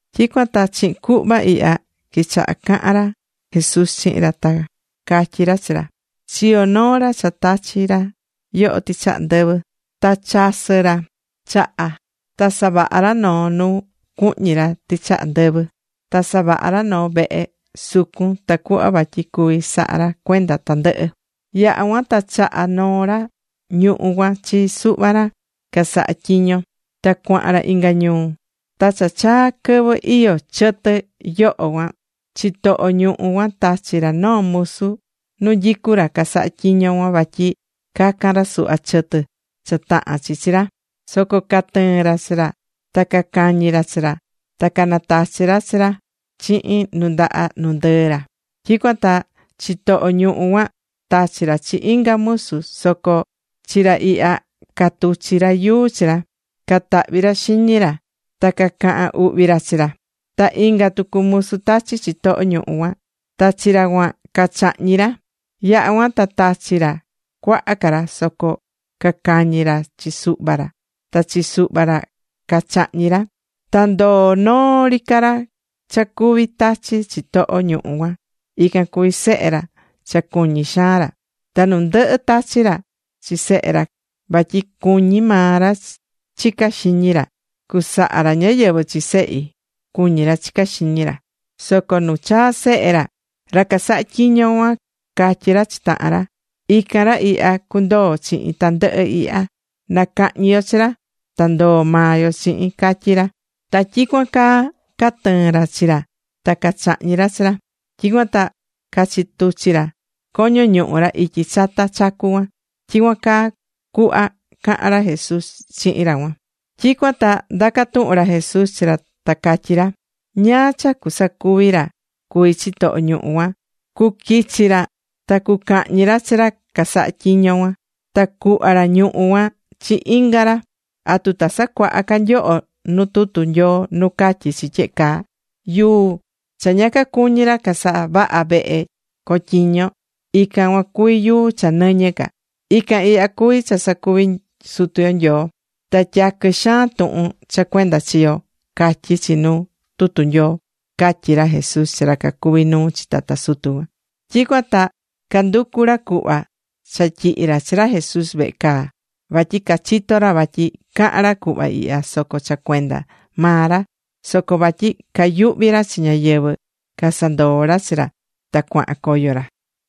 Tyicuan ta chihin cuhva ihya quichaha cahan ra Jesús chihin ra, ta catyí ra chi ra: ―Chiyo̱ noo ra cha tachi̱ ra yoho tɨchaha ndɨvɨ. Ta chasɨ̱ ra chaha. Ta savaha̱ ra noo nu cuhñi ra tɨchaha ndɨvɨ. Ta savaha̱ ra noo vehe sucun tacuhva vatyi cuví saha ra cuenda tandɨhɨ. ’Yaha̱ cuan ta chaha̱ noo ra ñuhú cuan chi suhva ra casahá tyiño. Ta cuahan ra inga ñuu. Ta cha chaa̱ quɨvɨ iyó chɨtɨ yoho cuan, chitoho ñuhú cuan tachi̱ ra noo musu nu nyicú ra casahá tyiño cuan vatyi cacan ra suhva chɨtɨ cha tahán chi chi ra. Soco catɨɨ̱n ra chi ra. Ta cacañi̱ ra chi ra. Ta canatachi̱ ra chi ra chihin nu ndaha nu ndɨɨ ra. Tyicuan ta chitoho ñuhú cuan tachi̱ ra chi inga musu, soco chi ra ihya catuchi̱ ra yuu chi ra, catahvi̱ ra xiñi ra, ta cacahan uhvi ra chi ra. Ta inga tucu musu tachi̱ chitoho ñuhú cuan. Ta chi ra cuan cachahñi̱ ra. Yaha̱ cuan ta tachi̱ ra cuaha ca ra. Soco cacañi̱ ra chi suhva ra. Ta chi suhva ca ra cachahñi̱ ra. Ta ndoo noo ri ca ra cha cuví tachi chitoho ñuhú cuan. Ican cuví sehe ra cha cuñí xaan ra. Ta nu ndɨhɨ tachi̱ ra chi sehe ra vatyi cuñí maa ra chicá xiñi ra: “Cucasaha ra ñáyɨvɨ chi sehi”, cuñí ra chicá xiñi ra. Soco nu chaa̱ sehe ra, ra casahá tyiño cuan catyi̱ ra chi tahan ra: “Ican ra ihya cundoo chihin tandɨhɨ ihya. Na cahñi yo chi ra, ta ndoo maa yo chihin”, catyí ra. Ta tyicuan caa catɨɨ̱n ra chi ra ta cachahñi̱ ra chi ra. Tyicuan ta cachituchi̱ ra coño ñuhu ra ityi chata chacu cuan ―tyicuan caa cuhva cahan ra Jesús chihin ra cuan. Tyicuan ta ndaca̱ tuhun ra Jesús chi ra ta catyí ra: ―¿Ñáá cha cusacuvi ra cuví chitoho ñuhú cuan? Cuquichi ra ta cucahñi ra chi ra casahá tyiño cuan. Ta cuhva ra ñuhú cuan chi inga ra. ¿Atu ta sacuaha ca nyoho nu tutu Nyoo nu catyí chi tyehe caa? Yuu cha ña cacuñi̱ ra casavaha vehe cotyiño ra, ican cuan cuví yuu cha nɨñɨ ca. Ican ihya cuví cha sacuvi̱ Sutu yo Nyoo. Ta tyaquɨ xaan tuhun cha cuenda chi yo, catyí chi nu tutu Nyoo ―catyí ra Jesús chi ra cacuví nuu chi tata sutu cuan. Tyicuan ta canducu ra cuhva cha tyihi ra chi ra Jesús vehe caa vatyi cachitó ra vatyi caha̱n ra cuhva ihya soco cha cuenda maa ra. Soco vatyi cayuhví ra chi ñáyɨvɨ, casandoo̱ ra chi ra, ta cuahan coyo ra.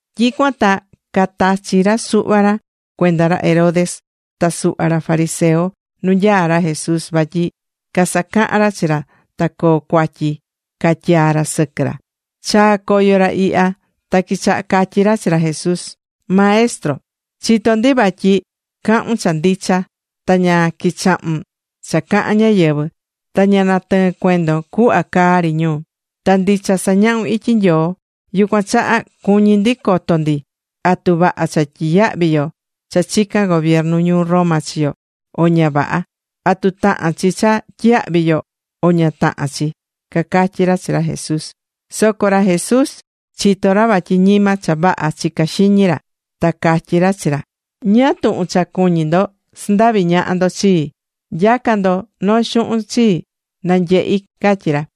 Tyicuan ta catachi̱ ra suhva ra cuenda ra Herodes ta suhva ra fariseo nu nyaá ra Jesús vatyi casacahan ra chi ra ta coo cuatyi catyaa ra sɨquɨ ra. Chaa̱ coyo ra ihya ta quichaha catyí ra chi ra Jesús: ―Maestro, chitó ndi vatyi cahún cha ndicha, ta ña quichahún cha cahán ñáyɨvɨ, ta ña natɨɨ́n cuendon cuhva caa ri ñu. Ta ndicha sañahún ityi Nyoo. Yucuan chaha cuñí ndi coto ndi, ¿atu vaha cha tyiyahvi yo cha chicán gobiernu ñuu Roma chi yo, o ña vaha? ¿Atu tahán chi cha tyiyahvi yo, o ña tahán chi? ―cacatyí ra chi ra Jesús. Soco ra Jesús chitó ra vatyi ñima cha vaha chicá xiñi ra, ta catyí ra chi ra: ―¿Ñáá tuhun cha cuñí ndo sandavi ñaha ndo chii? Nya̱ca ndo noo xuhun chii, na nyehi ―catyí ra.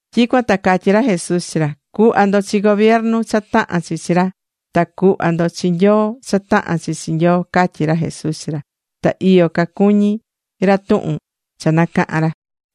Tyicuan ta catyí ra Jesús chi ra: ―Cu̱hva ndo chi gobiernu cha tahán chi chi ra. Ta cu̱hva tucu ndo chi Nyoo cha tahán chi Nyoo ―catyí ra Jesús chi ra. Ta iyo cacuñí ra tuhun cha nacaha̱n ra.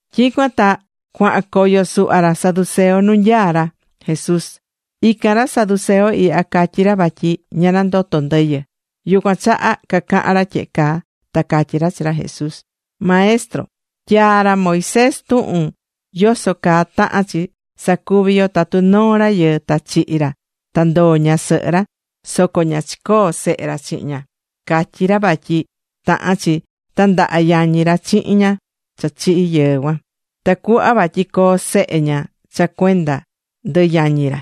Tyicuan ta cuahan coyo suhva ra saduceo nu nyaá ra Jesús. Ican ra saduceo ihya catyí ra vatyi ña nandotó ndɨyɨ. Yucuan chaha cacaha̱n ra tyehe caa ta catyí ra chi ra Jesús: ―Maestro, tyaa̱ ra Moisés tuhun yoso caa tahán chi sacuvi yo tatu noo rayɨɨ ta chihi̱ ra ta ndoo̱ ñasɨhɨ ra soco ña chicoo̱ sehe ra chihin ña. Catyí ra vatyi tahán chi tandaha yañi ra chihin ñaha cha chihi̱ yɨɨ cuan, tacuhva vatyi coo sehe ña cha cuenda ndɨ yañi ra.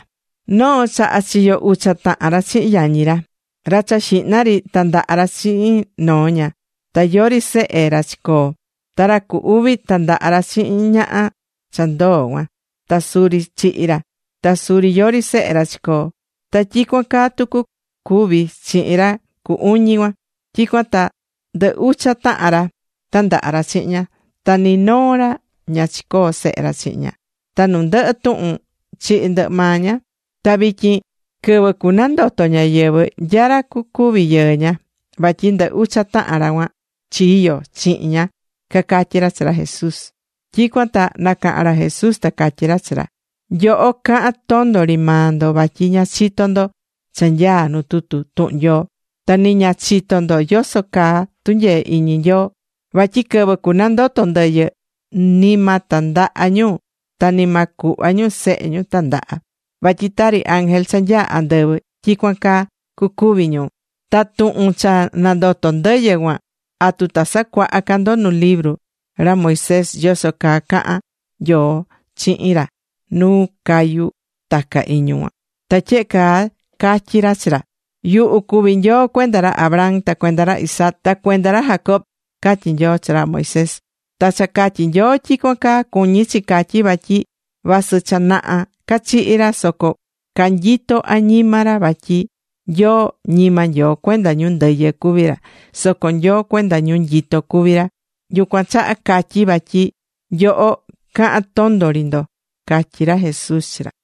Noo chaha chiyo̱ ucha tahan ra chihin yañi ra. Ra cha xihna ri tandaha̱ ra chihin noo ña, ta yori sehe ra chicoo̱. Ta ra cu uvi tandaha ra chihin ñaha cha ndoo̱ cuan. Ta suri chihi̱ ra. Ta suri yori sehe ra chicoo̱. Ta tyicuan caa tucu cuvi̱ chihin ra cu uñi cuan. Ta tyicuan caa ndɨ ucha tahan ra tandaha̱ chihin ña. Ta ni noo ra ña cachiyo̱ sehe ra chihin ña. Ta nu ndɨhɨ tuhun, chihi̱ ndɨhɨ maa ña. Ta vityin, quɨvɨ cunandoto ñáyɨvɨ, ¿nya ra cucuvi yɨɨ ña? Vatyi ndɨ ucha tahan ra cuan chiyo̱ chihin ña ―cacatyí ra chi ra Jesús. Tyicuan ta nacaha̱n ra Jesús ta catyí ra chi ra: ―Nyoho cahán tondo ri maa ndo, vatyi ña chitó ndo cha nyaá nu tutu tuhun Nyoo. Ta ni ña chitó ndo yoso caa tunyee iñi Nyoo. Vatyi quɨvɨ cunandoto ndɨyɨ, ni ma tandaha ñu ta ni ma cuhva ñu sehe ñu tandaha, vatyi tari ángel cha nyaá andɨvɨ tyicuan caa cucuvi ñu. Ta tuhun cha nandotó ndɨyɨ cuan, ¿atu ta sacuaha ca ndo nu libru ra Moisés yoso caa caha̱n Nyoo chihin ra nu cayú taca iñu cuan? Ta tyehe caa catyi̱ ra chi ra: “Yuhu cuví Nyoo cuenda ra Abraham, ta cuenda ra Isaac, ta cuenda ra Jacob”, catyí Nyoo chi ra Moisés. Ta cha catyí Nyoo tyicuan caa cuñí chi catyi vatyi vasɨ cha naha cachihi̱ ra, soco canyitó añima ra vatyi Nyoo ñima Nyoo cuenda ñu ndɨyɨ cuví ra, soco Nyoo cuenda ñu nyitó cuvi ra. Yucuan chaha catyí vatyi nyoho cahán tondo ri ndo ―catyí ra Jesús chi ra.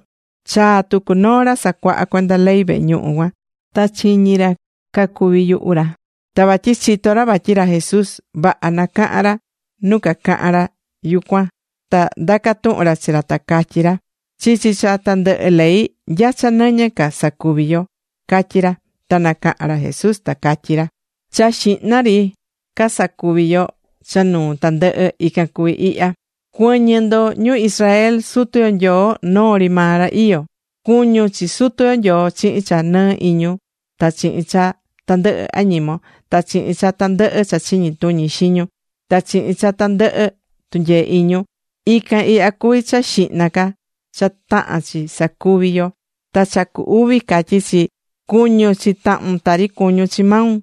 Chaa̱ tucu noo ra sacuahá cuenda ley vehe ñuhu cuan, ta chiñi̱ ra cacuví yuhu ra. Ta vatyi chitó ra vatyi ra Jesús vaha nacaha̱n ra nu cacahan ra yucuan, ta ndaca̱ tuhun ra chi ra ta catyí ra: ―Chichi cha tandɨhɨ ley, ¿nya cha nɨñɨ ca sacuvi yo? ―catyí ra. Ta nacaha̱n ra Jesús ta catyí ra: ―Cha xihna ca sacuví yo cha nuu tandɨhɨ, ican cuví ihya: “Cuɨ̱ñɨ ndo ñu Israel. Sutu yo Nyoo, noo ri maa ra iyó. Cu̱ñun chi Sutu yo Nyoo chihin cha nɨɨ iñun ta chihin cha tandɨhɨ añimon, ta chihin cha tandɨhɨ cha chiñi tuñi xiñun, ta chihin cha tandɨhɨ tunyee iñun.” Ican ihya cuví cha xihna ca cha tahán chi sacuvi yo. Ta cha cu uvi catyí chi: “Cu̱ñun chi tahun tari cuñún chi maun.”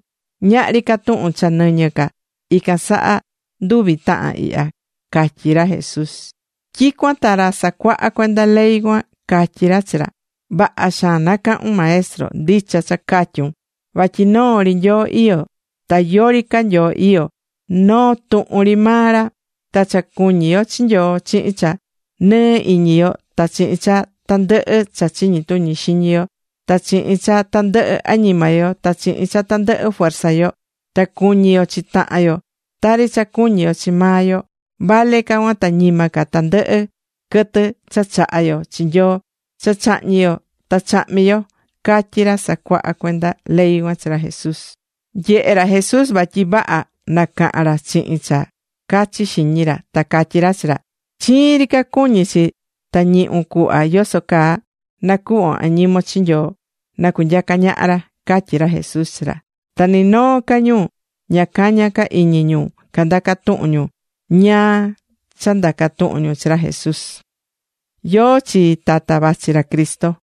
Ñahri ca tuhun cha nɨñɨ ca ican saha nduvi tahan ihya ―catyí ra Jesús. Tyicuan ta ra sacuahá cuenda ley cuan catyí ra chi ra: ―Vaha xaan nacahu̱n, Maestro. Ndicha cha catyún vatyi noo ri Nyoo iyó, ta yori ca Nyoo iyó, noo tuhun ri maa ra. Ta cha cuñí yo chi Nyoo chihin cha nɨɨ iñi yo ta chihin cha tandɨhɨ cha chiñi tuñi xiñi yo, ta chihin cha tandɨhɨ añima yo, ta chihin cha tandɨhɨ fuerza yo, ta cu̱ñi yo chi tahan yo tari cha cuñí yo chi maa yo, vale ca cuan ta ñima ca tandɨhɨ quɨtɨ cha chahá yo chi Nyoo cha chahñi̱ yo ta chahmi̱ yo ―catyí ra sacuaha cuenda ley cuan chi ra Jesús. Nyehe̱ ra Jesús vatyi vaha nacaha̱n ra chihin cha cachi xiñi ra. Ta catyí ra chi ra: ―Chiin ri ca cuñí chi ta ñihún cuhva yoso caa nacuhvon añimon chi Nyoo na cunyaca ñaha ra ―catyí ra Jesús chi ra. Ta ni noo ca ñu ña cañá ca iñi ñu candaca tuhun ñu ñáá cha ndaca tuhun ñu chi ra Jesús. ¿Yóó chi tata vachi ra Cristo?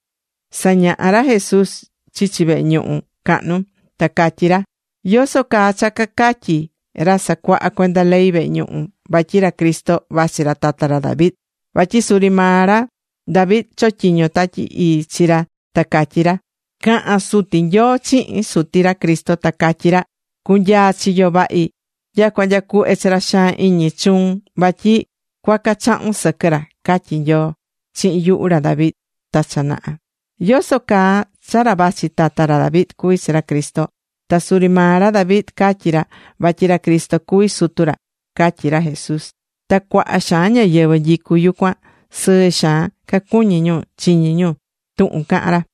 Sañahá ra Jesús chichi vehe ñuhu cahnu, ta catyí ra: ―¿Yoso caa cha cacatyí ra sacuahá cuenda ley vehe ñuhu vatyi ra Cristo vachi ra tata ra David? Vatyi suri maa ra David chotyiño̱ Tatyi Ii chi ra ta catyí ra: Caha̱n Suti Nyoo chihin Suti ra Cristo, ta catyí ra: “Cu̱nyaa chiyo vahi nyacua nya cuhve chi ra xaan iñi chuun vatyi cuaca chahun sɨquɨ ra”, catyí Nyoo chihin yuhu ra David ta cha naha. ¿Yoso caa cha ra vachi tata ra David cuví chi ra Cristo, ta suri maa ra David catyi̱ ra vatyi ra Cristo cuví Sutu ra? ―catyí ra Jesús. Ta cuaha xaan ñáyɨvɨ nyicú yucuan sɨɨ xaan cacuñí ñu chiñí ñu tuhun cahán ra.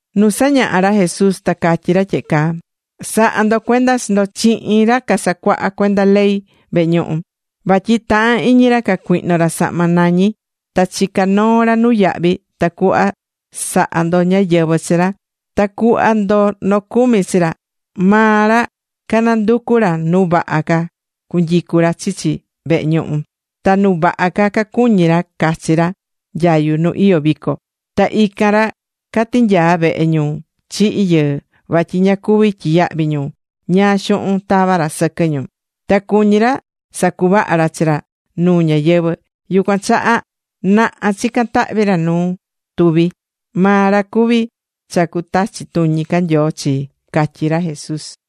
Nu sañahá ra Jesús ta catyí ra tyehe caa: ―Sa̱ha ndo cuenda chi ndo chihin ra casacuahá cuenda ley vehe ñuhu, vatyi tahán iñi ra cacuihno ra sahma nañi ta chicá noo ra nuyahvi tacuhva saha ndo ñáyɨvɨ chi ra, ta cuhva ndo nocumi chi ra. Maa ra cananducú ra nu vaha ca cunyicu ra chichi vehe ñuhu. Ta nu vaha ca cacuñí ra cachi ra nyayu nu iyó vico. Ta ican ra catinyaá vehe ñu chihi̱ yɨɨ, vatyi ña cuví tyiyahvi ñu ñáá xuhun tava ra sɨquɨ ñu. Ta cuñí ra sacuvaha ra chi ra nuu ñáyɨvɨ. Yucuan chaha naha chicán tahvi ra nu tuvi. Maa ra cuví cha cutachi tuñi ca Nyoo chii ―catyí ra Jesús.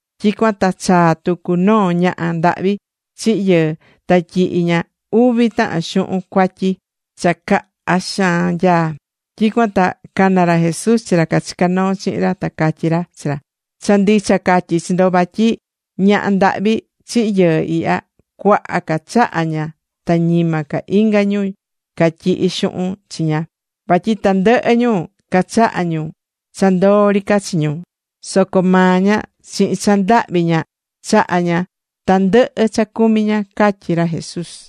Tyicuan ta chaa̱ tucu noo ñaha ndahvi chihi̱ yɨɨ, ta tyihi̱ ña uvi tahan xuhun cuatyi cha caha xaan nyaá. Tyicuan ta cana̱ ra Jesús chi ra cachicá noo chihin ra, ta catyí ra chi ra: ―Cha ndicha catyí chi ndo vatyi ñaha ndahvi chihi̱ yɨɨ ihya, cuaha ca chaha̱ ña ta ñima ca inga ñu catyihí xuhun chiña. Vatyi tandɨhɨ ñu cachaha̱ ñu cha ndoo ri ca chi ñu. Soco maa ña chihin cha ndahvi ña chaha̱ ña tandɨhɨ cha cumí ña ―catyí ra Jesús.